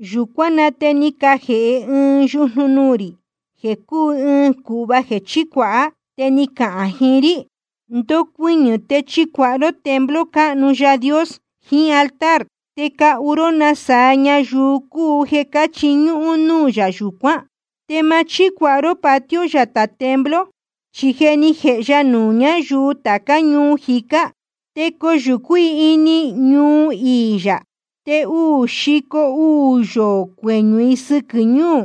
Yūcuán na te ni cajēhe ɨɨn yujnu nuū rī, jeē cúu ɨɨn cūhva jeē chícuāha. Te ni cacahān jiín rí: Ndocuɨñɨ̄ te chicuāha ró templo cáhnu Yaā Dios jiín altar, te cahu ró nasaa ñayuu cúu jeē cáchiñúhún núū yā yūcuán. Te ma chícuāha ró patio yatā templo. Chi je ni jēhe ya nuū ñáyuu tācá ñuu jicá. Te coyūcú i ini ñuu iī yāhá, te uū xico uū yoō cueñū i sɨquɨ̄ ñuu.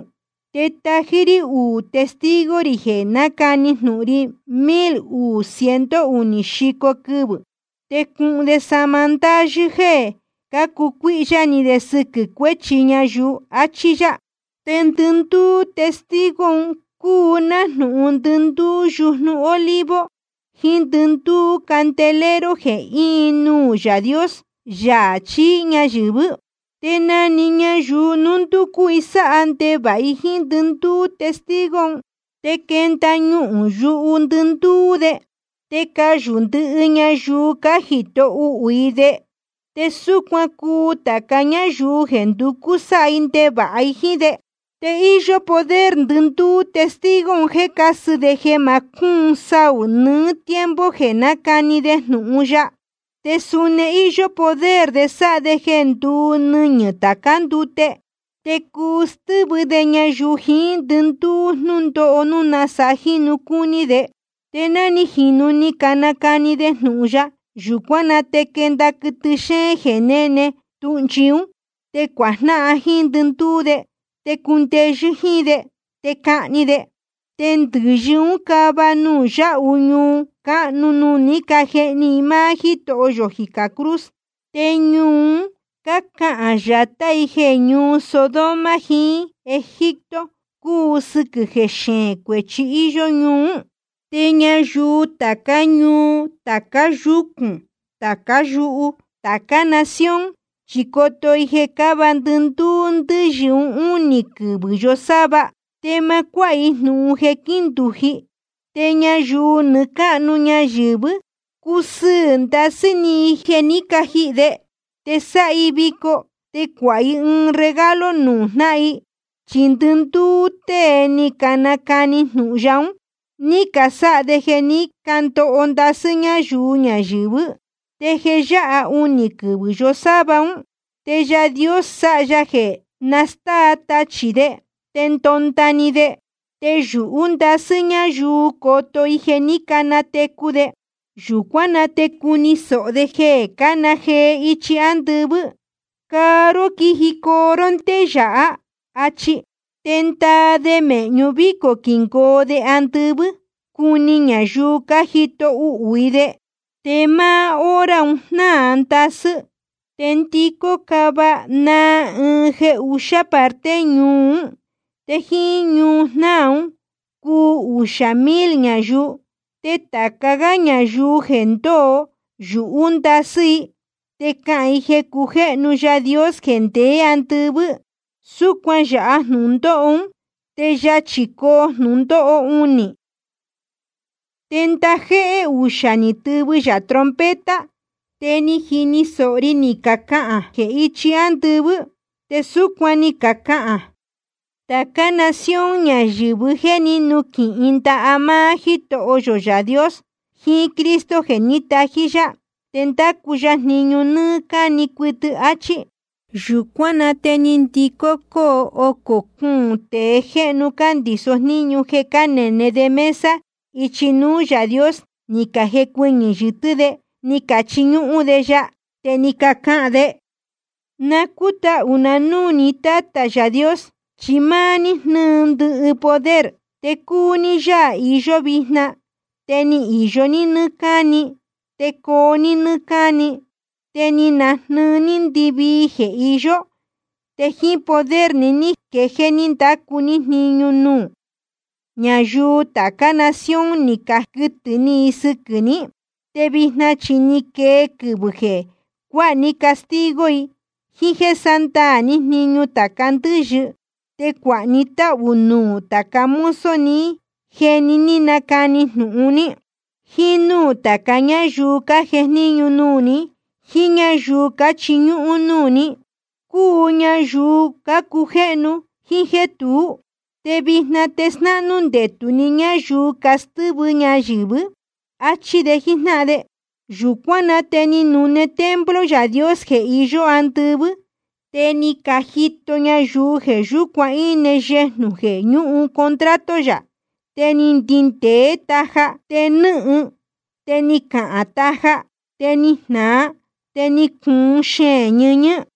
Te tají rí uū testigo rī jeē nácani jnūhun ri mil uū ciento unī xico quɨvɨ̄. Te cuhun de sahma ndáyɨ́ jéē cácucuíhyá ni de sɨquɨ̄ cuéchi ñayuu, achí yá. Te ndɨndúú testigo un cúu nájnūhun ndɨndúú yujnu olivo jiín ndɨndúú candelero jeē íin nuū Yaā Dios, Yaā chií ñayɨ̄vɨ́. Te na‑ni ñayuu núu nducú sáha ndevāha jíín ndɨndúú testigo un, te quenda ñuhūn yuhu ndɨndúú de, te cayū ndɨhɨ ñayuu cájito uhū i de. Te súcuan cuu tāca ñáyuu jeē nducú sáha ndevāha jíín de. Te íyó poder ndɨndúú testigo un jéē cásɨ de jeē ma cúun saū nɨɨ́ tiempo jeē nácani de jnūhun ya. Te suni íyó poder de sáha de jeē nduu nɨñɨ̄ tācá ndute. Te cuu stɨ́vɨ de ñayɨ̄vɨ jíín ndɨnuū jnūndóho, núu nasaa jínu cácuni de. Te ná ni jīnu ni canacani de jnūhun ya, yūcuán na te quenda quɨtɨ xéén jeē néne tūhnchi ún. Te cuajnáhan jíín ndɨndúú de, te cundeyɨ́ jíín de, te cahni de. Te ndɨ̄yɨ ún cava nuū yáhu ñuu cáhnu nuū ní cajehni i máá Jítoho yō jicā cruz. Te ñuu un cácahān yatá i jeē ñuu Sodoma jiín Egipto cúu, sɨquɨ̄ jeē xeēn cuēchi íyó ñuu ún. Te ñayuu tācá ñuu, tāca yúcūn, tācá yuhu, tācá nación, chi coto i jeē cáva ndɨndúú ndɨ́yɨ un únī quɨvɨ̄ yosáva, te ma cuáha i jnūhun jeē quíndūji. Te ñayuu nɨɨ́ cáhnu ñayɨ̄vɨ́ cusɨɨ̄ ndasɨ́ ni i jeē ní cajihī de, te sáha i vico, te cuāha i regalo nuū jnáhan i. Chi ndɨndúú tée ni canacani jnūhun ya ún, ní casáha de jeē ní candoho ndasɨ́ ñáyuu ñayɨ̄vɨ́. Te jeē yáha unī quɨvɨ̄ yosáva ún, te Yaā Dios sáha ya jeē nastáa tachī de, te ndonda‑ni de. Te yūhú ndasɨ́ ñáyuu coto i jeē ní canatecu de. Yūcuán na te cuni sōho de jeē cána jee ichi ándɨvɨ́: Caa ró quijicoo ró ndé yāhá, áchí. Te ndaa de mēhñu vícō quingoo de andɨvɨ́, cuni ñayuu cájito uhū i de. Te máá hora un jnáa ndasɨ́, te ndicó cáva naa ɨɨn jeē uxí parte ñuu ún. Te jíín ñujnáa ún cuu uxā mil ñayuu. Te tāca gá ñayuu jeē ndóo, yūhú ndasɨ́ i, te cahān i jeē cujéhnu Yaā Dios jeē ndeé andɨvɨ́. Súcuan yāha jnūndóho uū, te yachī coo jnūndóho unī. Te ndajéhé uxā ni tɨvɨ yā trompeta. Te ni jini sōho ri ni cacahān jee ichi ándɨvɨ́. Te súcuan ni cacahān: Tācá nación ñayɨ̄vɨ́ je ni nuquɨhɨ ndaha máá Jítoho yō Yaā Dios jiín Cristo jeē ní tají yá. Te ndacu ya jniñu nɨ́ɨ́ cáni cuɨtɨ. Achí. Yūcuán na te ndɨhócó cuūn tēe jéhnu cándiso jníñu jeē cánene de mesa de ichi núú Yaā Dios, ni cajecuɨñɨ̄ yɨtɨ́ de, ni cachiñúhún de ya. Te ni cacahān de: Na cútahū na núū ní, Tátā Yaā Dios, chi máá ní jnɨ́ɨ ndɨhɨ poder, te cúu ní Yaā iyó vijna, te ni īyo ní nɨ́ɨ́ cáni, te coo ní nɨ́ɨ́ cáni. Te ni najnɨɨ ní ndɨvii jeē iyó, te jíín poder ni ní quejéé ní ndácu ní jniñu nuū. Ñayuu tācá nación ni caquɨtɨ̄ ni i sɨquɨ̄ ní. Te vijna chi ni quee quɨvɨ̄ jeē cuáha ní castigo i, jíín jéē sándaā ní jniñu tāca ndɨ́yɨ. Te cuāha ni táhū nuū tāca mozo ni jéē ní canacani jnūhun ní, jíín núū tāca ñáyuu cájejníñu nuū ní, jíín ñáyuu cáchiñúhún núū ní, cúu ñayuu cácujéhnu jíín jéē tuú. Te vijna te snáhnú ndetū ni ñáyuu castɨ́vɨ ñayɨ̄vɨ́. Achí de jíjnáhan de. Yūcuán na te ni nune templo Yaā Dios jeē iyó andɨvɨ́. Te ni cajito ñayuu jeē yúcuan íne yejnū jeē ñúhun contrato yā. Te ni ndindēé taja, te nɨ́hɨn, te cáhán taja, te ni jnāa, te ni cuun xeēn ñɨñɨ́.